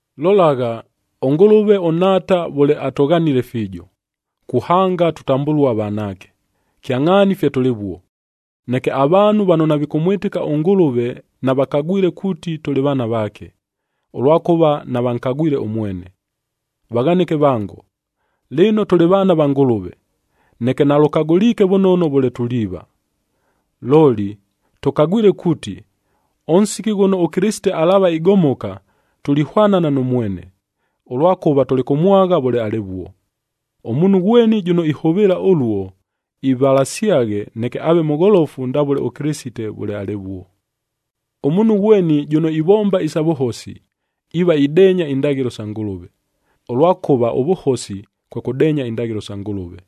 Lolagha, ʉNgʉlʉve ʉNhaata vʉle atʉghanile fiijo, kuhanga tutambʉlua vanaake! Kyangʼhaani fye tʉlɨvuo. Neke avaanhu vano navikʉmwɨtɨka ʉNgʉlʉve navakagwile kuuti tʉlɨ vaana vaake, ʉlwakʉva navankagwile ʉmwene. Vaghanɨke vango, lɨno tʉlɨ vaana va Ngʉlʉve, neke nalʉkagʉliike vʉnono vʉle tuliiva. Looli tʉkagwile kuuti, ʉnsiki ghʉno ʉKɨlɨsite alaava igomoka, tulihwanana nʉ mwene, ʉlwakʉva tulikʉmwagha vʉle alɨvuo. Ʉmuunhu ghweni jʉno ihʉvɨɨla ʉluo, ivalasyaghe neke aave mʉgholofu ndavʉle ʉKɨlɨsite vʉle alɨvuo. Ʉmuunhu ghweni jʉno ivomba isa vʉhosi, iiva ideenya indaghɨlo sa Ngʉlʉve, ʉlwakʉva ʉvʉhosi, kwe kʉdeenya indaghɨlo sa Ngʉlʉve.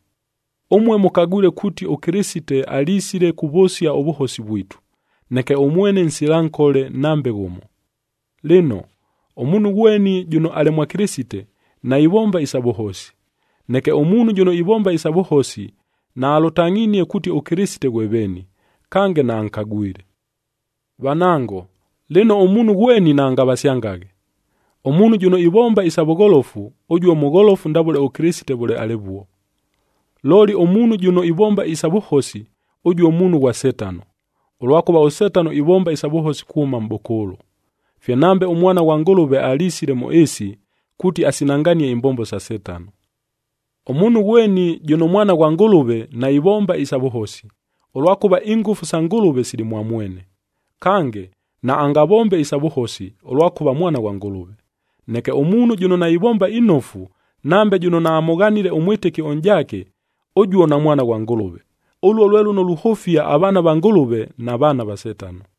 Ʉmue mʉkagwile kuuti ʉKɨlɨsite alisile kuvʉsia ʉvʉhosi vwitu, neke ʉmwene nsila nkole nambe ghʉmo. Lɨno, ʉmuunhu ghweni jʉno alɨ mwa Kɨlɨsite, naivomba isa vʉhosi. Neke ʉmuunhu jʉno ivomba isa vʉhosi, naalʉtangʼhinie kuuti ʉKɨlɨsite ghwe veeni, kange naankagwile. Vanango, lɨno ʉmuunhu ghweni naangavasyangaghe. Ʉmuunhu jʉno ivomba isa vʉgholofu, ʉjuo mʉgholofu ndavʉle ʉKɨlɨsite vʉle alɨvuo. Looli ʉmuunhu jʉno ivomba isa vʉhosi, ʉjuo muunhu ghwa Setano, ʉlwakʉva ʉSetano ivomba isa vʉhosi kuhʉma mʼbʉkʉʉlʉ. Fye nambe ʉMwana ghwa Ngʉlʉve alisile mʉ ɨɨsi, kuuti asinanganie imbombo sa Setano. Ʉmuunhu ghweni jʉno mwana ghwa Ngʉlʉve, naivomba isa vʉhosi, ʉlwakʉva ingʉfu sa Ngʉlʉve sili mwa mwene. Kange, naangavombe isa vʉhosi, ʉlwakʉva mwana ghwa Ngʉlʉve. Neke ʉmuunhu jʉno naivomba inofu, nambe jʉno naamʉghanile ʉmwɨtɨki ʉnʼjaake, ʉjuo namwana ghwa Ngʉlʉve. Ʉluo lwe lʉno luhʉfia avaana va Ngʉlʉve, na vaana va Setano.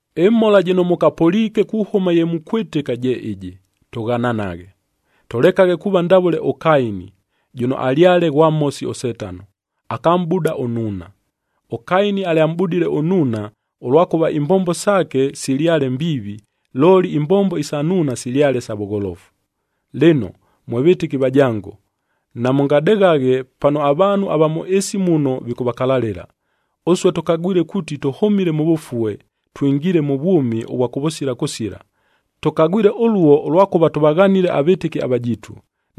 Ɨmhola jɨno mʉkapʉliike kuhʉma ye mukwɨtɨka je ɨjɨ: Tʉghananaghe! Tʉlekaghe kuuva ndavʉle ʉKaini, jʉno alyale ghwa Mhosi ʉSetano, akamʼbuda ʉnnuuna.a ɄKaini alyamʼbudile ʉnnuuna, ʉlwakʉva imbombo saake silyale mbiivi, looli imbombo isa nnuuna silyale sa vʉgholofu. Lɨno mwe vɨtɨki vajango, namʉngadeghaghe pano avaanhu ava mʉ ɨɨsi muno vikʉvakalalɨla. Ʉsue tʉkagwile kuuti tʉhʉmile mʉ vʉfue, twingiile mʉ vwʉmi ʉvwa kʉvʉsila kʉsila. Tʉkagwile ʉluo, ʉlwakʉva tʉvaghanile avɨtɨki avajiitu.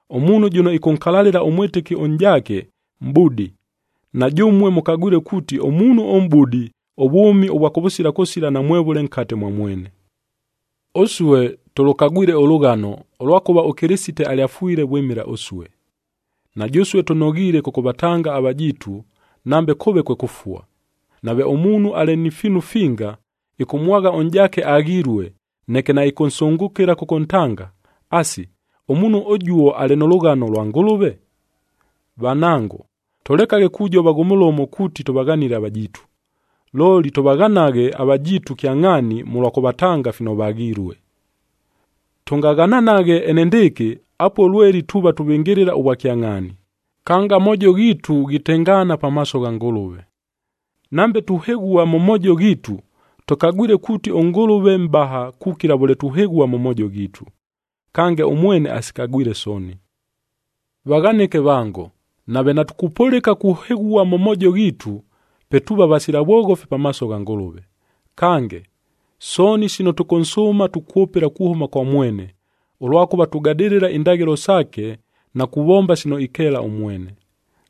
Ʉmuunhu jʉno ɨkʉnkalalɨla ʉmwɨtɨki ʉnʼjaake, mʼbudi. Na jʉmue mʉkagwile kuuti, ʉmuunhu ʉmʼbudi, ʉvwʉmi ʉvwa kʉvʉsila kʉsila namwevʉle nkate mwa mwene. Ʉsue tʉlʉkagwile ʉlʉghano, ʉlwakʉva ʉKɨlɨsite alyafwile vwɨmɨla ʉsue. Na jʉsue tʉnoghiile kʉkʉvatanga avajiitu, nambe kʉʉve kwe kʉfua. Nave ʉmuunhu alɨ ni fiinu finga, ɨkʉmwagha ʉnʼjaake aghilue, neke naɨkʉnsʉngʉkɨla kʉkʉntanga, asi, ʉmuunhu ʉjuo alɨ nʉ lʉghano lwa Ngʉlʉve? Vanango, tʉlekaghe kujova ghʉ mʉlomo kuuti tʉvaghanile avajiitu, looli tʉvaghanaghe avajiitu kyangʼhaani mʉlwa kʉvatanga fino vaghilue. Tʉngaghananaghe enendɨɨkɨ, apuo lweli tuuva tuvɨngɨlɨla ʉvwakyangʼhaani, kange amoojo ghiitu ghitengaana pamaaso gha Ngʉlʉve. Nambe tuhɨghua mʉ moojo ghiitu, tʉkagwile kuuti ʉNgʉlʉve mʼbaha kukila vʉle tuhɨghua mʉ moojo ghiitu, kange ʉmwene asikagwile sooni. Vaghanɨke vango, nave natukupʉlɨka kuhɨghua mʉ moojo ghiitu, pe tuuva vasila vwoghofi pamaaso gha Ngʉlʉve. Kange, sooni sino tʉkʉnsʉʉma tukwʉpɨla kuhʉma kwa mwene, ʉlwakʉva tugadɨlɨla indaghɨlo saake na kuvomba sino ikeela ʉmwene.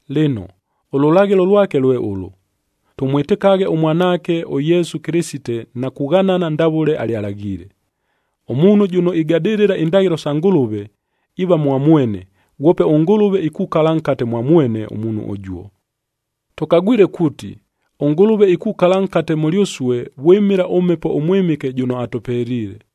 Lɨno, ʉlʉlaghɨlo lwake lwe ʉlʉ: Tʉmwɨtɨkaghe ʉMwanaake ʉYesu Kɨlɨsite na kughanana ndavʉle alyalaghiile. Ʉmuunhu jʉno igadɨlɨla indaghɨlo sa Ngʉlʉve, iiva mwa mwene, ghwope ʉNgʉlʉve ikukala nkate mwa mwene ʉmuunhu ʉjuo. Tʉkagwile kuuti, ʉNgʉlʉve ikukala nkate mʉlyʉsue vwɨmɨla ʉMhepo ʉMwɨmɨke jʉno atʉpeliile.